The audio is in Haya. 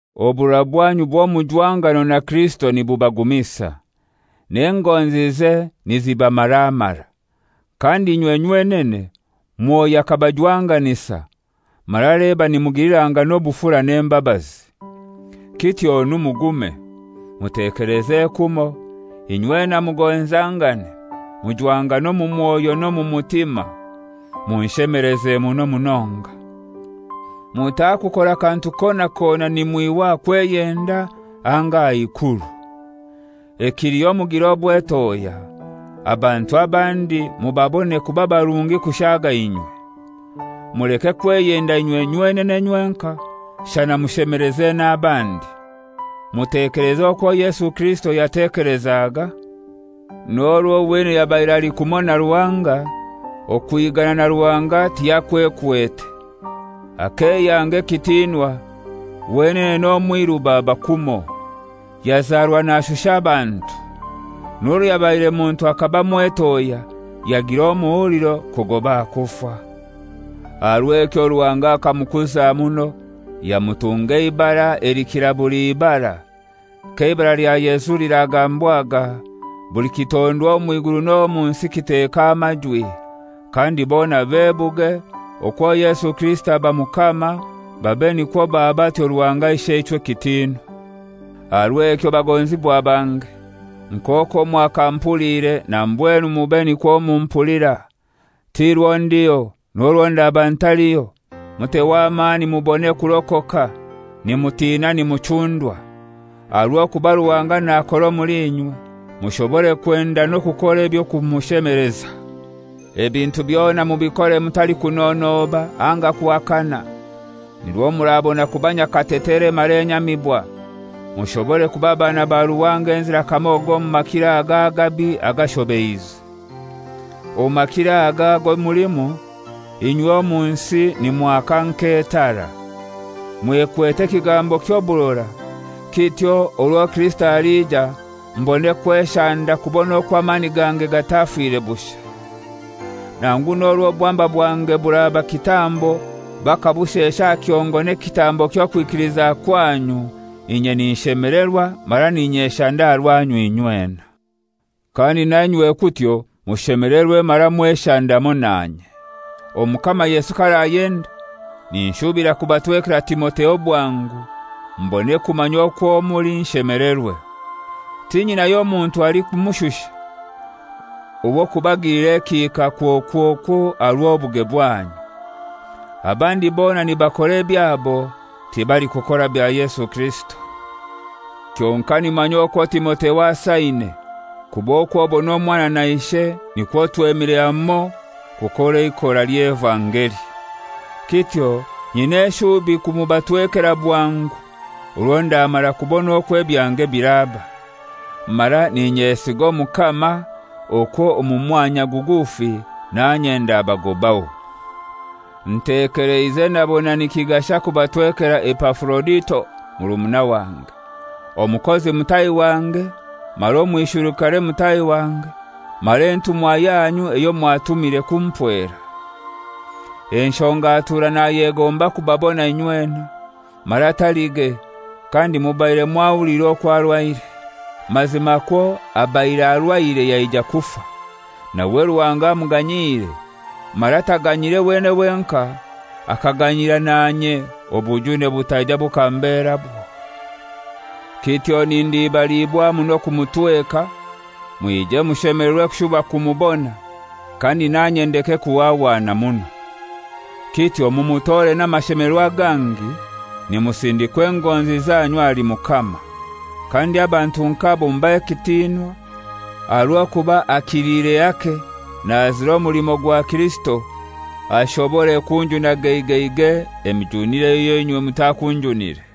Oburora bwanyu bw'omujwangano na Kirisito nibubagumisa, n'engonzize nizibamaramara. Kandi inywe nywenene Mwoyo akabajwanganisa, mara leba nimugilirangana obufura n'embabazi. Kityonu mugume, mutekeleze kumoi, inywena mugonzangane, mujwangane omu mwoyo n'omu mutima, munshemeleze muno munonga. Mutakukora kantu kona kona nimwihwa aha kweyenda anga aha ikuru. Ekiliho mugire obwetohya, abantu abandi mubabone kuba barungi kushaaga inywe. Muleke kweyenda inywe nywenene nywenkai, shana mushemeleze n'abandi. Mutekeleze okwo Yesu Kirisito yatekelezaga: N'orwo wenene yabaire ali kumoi na Ruhanga, okwigana na Ruhanga tiyakwekwete. Akeyanga ekitinwa, wenene n'omwiru baba kumoi; yazarwa nashusha abantu. N'orwo yabaire muntu akaba mwetohya, yagira n'omuhuliro kugoba aha kufa. Aha rw'ekyo Ruhanga akamukuza muno, yamutunga eibara elikira buli ibara; k'eibara lya Yesu liragambwaga buli kitondwa omw'iguru n'omu nsi kiteke amajwi, kandi bona bebuge okwo Yesu Kirisito aba Mukama, babe nikwo baha batyo Ruhanga Isheichwe ekitinwa. Aha rw'ekyo bagonzibwa bange, nk'okwo mwakamupuliire na mbwenu mube nikwo mumpulira; ti rwo ndiho, n'orwo ndaba ntaliho, muteho amani mubone kurokoka, nimutina nimuchundwa. Aha rw'okuba Ruhanga nakora omuli inywe, mushobore kwenda n'okukora eby'okumushemeleza. Ebintu byona mubikore mutalikunonoba anga kuhakana, nirwo murabona kuba nyakatetere mara enyamibwa, mushobore kuba bana ba Ruhanga enzira kamogo omu makiro aga agabi agashobeize. Omu makiro aga ago mulimu, inywe omu nsi nimwaka nk'etara, mwekwete ekigambo ky'oburora, kityo orwo Kirisito alija mbone kweshanda kubona okwo amani gange gatafire bushai. Nangu n'orwo obwamba bwange buraba kitambo bakabushesha aha kihongo n'ekitambo ky'okwikiliza kwanyu, inye ninshemelerwa mara ninyeshanda aha rwanyu inywena. Kandi nainywe kutyo mushemelerwe mara mweshande hamoi nanye. Omukama Yesu k'arayenda ninshubira kubatwekera Timotheo bwangu mbone kumanya okwo muli nshemelerwe. Tinyinayo muntu alikumushusha, ow'okubagilira ekihika kwokwokwo aha rw'obuge bwanyu. Abandi bona nibakora ebyabo, tibalikukora bya Yesu Kirisito. Kyonkai nimumanya okwo Timotheo asaine, kuba okw'obona omwana na ishe, nikwo twemire hamoi kukora eikora ly'evangeli. Kityo nyina eshubi kumubatwekera bwangu orwo ndamara kubona okwo ebyange biraba. Mara n'inyesiga Omukama okwo omu mwanya gugufi nanye ndabagobaho. Ntekeleize nabona nikigasha kubatwekera Epafurodito murumuna wange, omukozi mutahi wange mara omwisherukare mutahi wange, mara entumwa yanyu eyo mwatumire kumpwera. Enshonga atura nayegomba kubabona inywena; mara talige, kandi mubaire mwahuliire okwo arwaire. Mazimakwo abaire arwaire yaija kufa. Nawe Ruhanga amuganyiire, mara taganyiire wenene wenkai, akaganyira na inye, obujune butaija bukamberabwo. Kityo nindibaliibwa muno kumutweka, mwije mushemelerwe kushuba kumubona, kandi nanye ndeke kuhwahwana muno. Kityo mumutore n'amashemelerwa gangi nimusindikwa engonzi zanyu ahali Mukama; kandi abantu nk'abo mubahe ekitinwa, aha rw'okuba akiliire hake nazira omulimo gwa Kirisito, abase kunjuna geigeigei emijunire eyo inywe mutakunjunire.